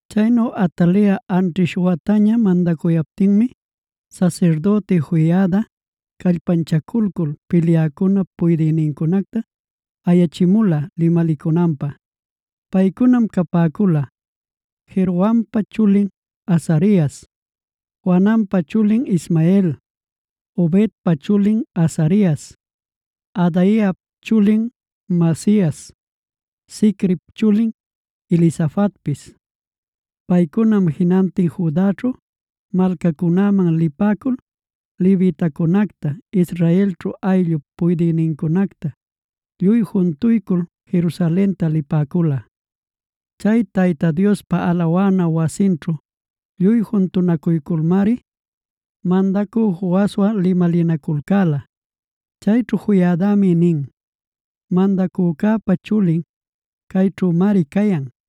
Chaynu Atalia anćhish wataña mandacuyaptinmi, sasirdüti Joiada callpanchaculcul pilyäcunap puydïnincunacta ayachimula limalicunanpä. Paycunam capäcula: Jerohampa chulin Azarias, Johananpa chulin Ismael, Obedpa chulin Azarias, Adaiap chulin Maasias, Zicrip chulin Elisafatpis. Paycunam jinantin Judaćhu malcacunäman lipäcul levitacunacta Israelćhu ayllup puydïnincunacta lluy juntuycul Jerusalenta lipäcula. Chay Tayta Diospa alawana wasinćhu lluy juntunacuyculmari mandacü Joaswan limalinaculcäla. Chayćhu Joiadami nin: “Mandacücäpa chulin cayćhümari cayan.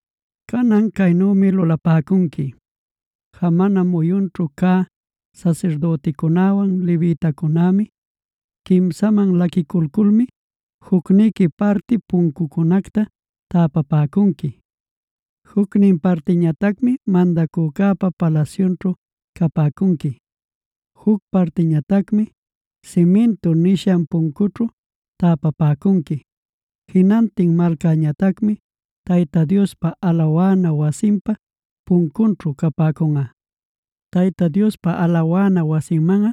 Canan caynümi lulapäcunqui. Jamana muyunćhu cä sasirdüticunäwan levitacunämi quimsaman laquiculculmi, jucniqui parti puncucunacta täpapäcunqui. Jucnin partiñatacmi mandacücäpa palasyunćhu capäcunqui. Juc partiñatacmi Simintu nishan puncućhu täpapäcunqui. Jinantin malcäñatacmi Tayta Diospa alawana wasinpa patyunćhu capäcunꞌa. Tayta Diospa alawana wasinmanꞌa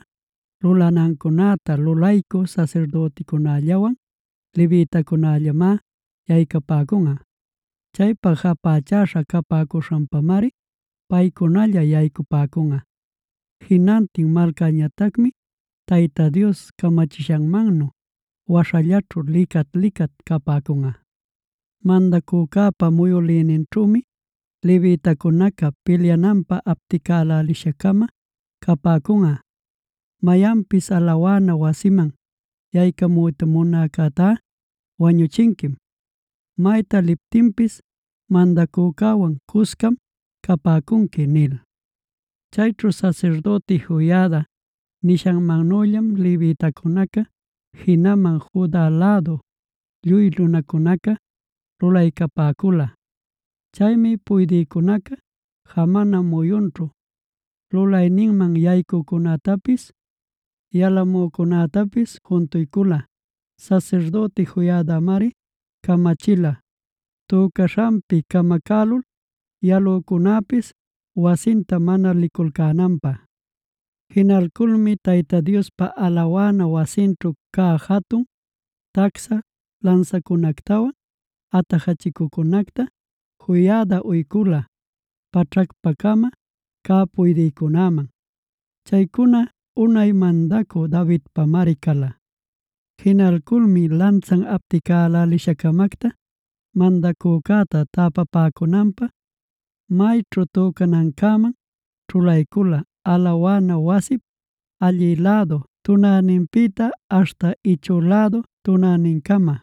lulanancäta lulaycü sasirdüticunällawan levitacunällamá yaycapäcunꞌa. Chaypa japächäśha capäcuśhanpamari paycunalla yaycapäcunꞌa. Jinantin malcäñatacmi Tayta Dios camachishanmannu waśhallaćhu licat-licat capäcunꞌa. Mandacücäpa muyülïninćhümi levitacunaca pilyananpä apticälälisha-cama cunćhalapäcunꞌa. Mayanpis alawana wasiman yaycamuyta munäcätá wañüchinquim. Mayta liptinpis mandacücäwan cuscam capäcunqui” nil. Chaynu sasirdüti Joiada nishantanüllam levitacunaca, jinaman Juda lädu lluy nunacunaca lulaycapäcula. Chaymi puydïcunaca jamana muyunćhu lulayninman yaycücunätapis, yalamücunätapis juntuycula. Sasirdüti Joiadamari camachila tücaśhanpi camacälul yalücunäpis wasinta mana liculcänanpä. Jinalculmi Tayta Diospa alawana wasinćhu cä jatun, tacsha lansacunactawan atajachicucunacta Joiada uycula, paćhacpa-cama cä puydïnincunaman. Chaycuna unay mandacü Davidpamari cala. Jinalculmi lansan apticälälisha-camacta mandacücäta täpapäcunanpä mayćhu tücanancäman ćhulaycula alawana wasip allï lädu tunäninpïta aśhta ichü lädu tunänincama.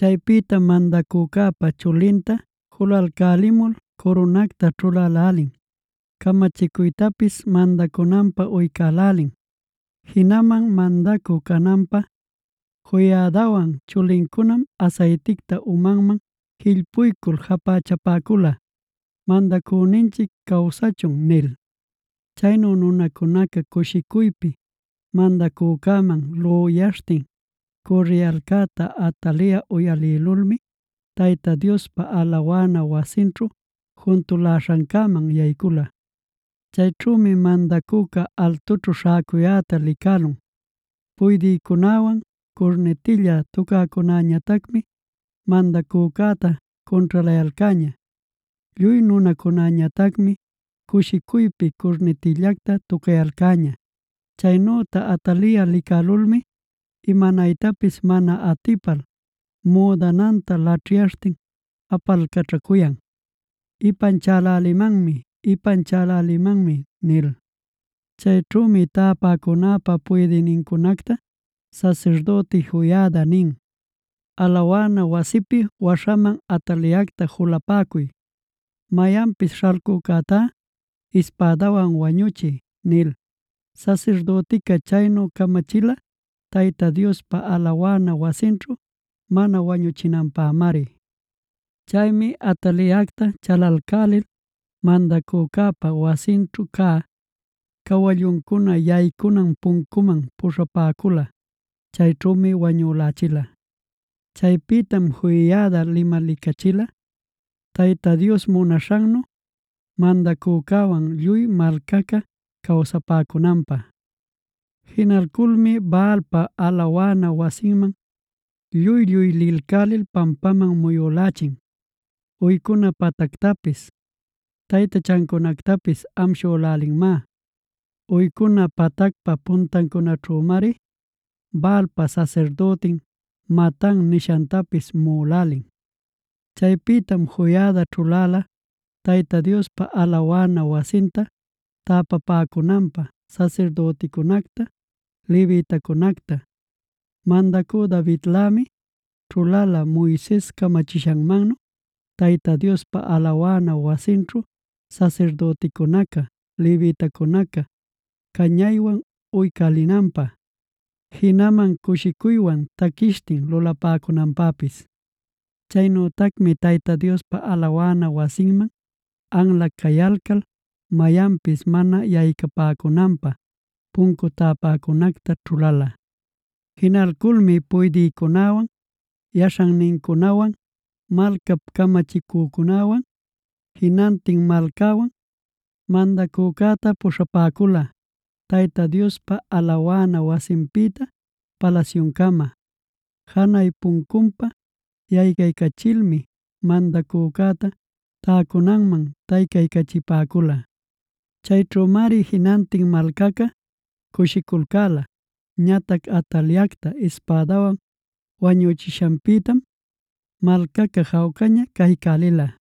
Chaypïtam mandacücäpa chulinta julalcälimul curunacta ćhulälälin, camachicuytapis mandacunanpä uycälälin. Jinaman mandacü cananpä Joiadawan chulincunam asayticta umanman jillpuycul japächapäcula: “¡Mandacüninchic cawsachun!” nil. Chaynu nunacunaca cushicuypi mandacücäman lüyaśhtin cürriyalcäta Atalia uyalïlulmi, Tayta Diospa alawana wasinćhu juntaläśhancäman yaycula. Chayćhümi mandacüca altućhub śhäcuyäta licälun. Puydïcunäwan curnitilla tucäcunäñatacmi mandacücäta cunćhalayalcäña. Lluy nunacunäñatacmi cushicuypi curnitillacta tucayalcäña. Chaynüta Atalia licälulmi, imanaytapis mana atipal müdananta laćhyaśhtin apalcaćhacuyan: “¡Ipanchälälimanmi! ¡Ipanchälälimanmi!” nil. Chayćhümi tapäcunäpa puydïnincunacta sasirdüti Joiada nin: “Alawana wasipi waśhaman Ataliacta julapäcuy. Mayanpis śhalcücätá ispädawan wañuchiy” nil. Sasirdütica chaynu camachila Tayta Diospa alawana wasinćhu mana wañuchinanpämari. Chaymi Ataliacta chalalcälil mandacücäpa wasinćhu cä Cawallucuna Yaycunan puncuman puśhapäcula. Chayćhümi wañülächila. Chaypïtam Joiada limalicachila, Tayta Dios munaśhannu mandacücäwan lluy malcaca cawsapäcunanpä. Jinalculmi Baalpa alawana wasinman lluy-lluy lilcälil pampaman muyülächin. Uycuna patactapis, taytachancunactapis amshülälinmá. Uycuna patacpa puntancunaćhümari Baalpa sasirdütin Matan nishantapis muꞌülälin. Chaypïtam Joiada ćhuläla Tayta Diospa alawana wasinta täpapäcunanpä sasirdüticunacta, levitacunacta. Mandacü Davidlämi ćhulaycula Moises camachishanmannu Tayta Diospa alawana wasinćhu sasirdüticunaca, levitacunaca cañaywan uycälinanpä, jinaman cushicuywan taquishtin lulapäcunanpäpis. Chaynütacmi Tayta Diospa alawana wasinman anla cayalcal mayanpis mana yaycapäcunanpä puncu täpäcunacta ćhulala. Jinalculmi puydïcunäwan, yaśhannincunawan, malcap caminaycücunäwan, jinantin malcäwan mandacücäta puśhapäcula, Tayta Diospa alawana wasinpïta palasyucama. Janay puncunpa yaycaycachilmi mandacücäta täcunanman taycaycachipäcula. Chayćhümari jinantin malcaca cushiculcäla. Ñatac Ataliactá ispädawan wañuchishanpïtam malcaca jawcaña caycälila.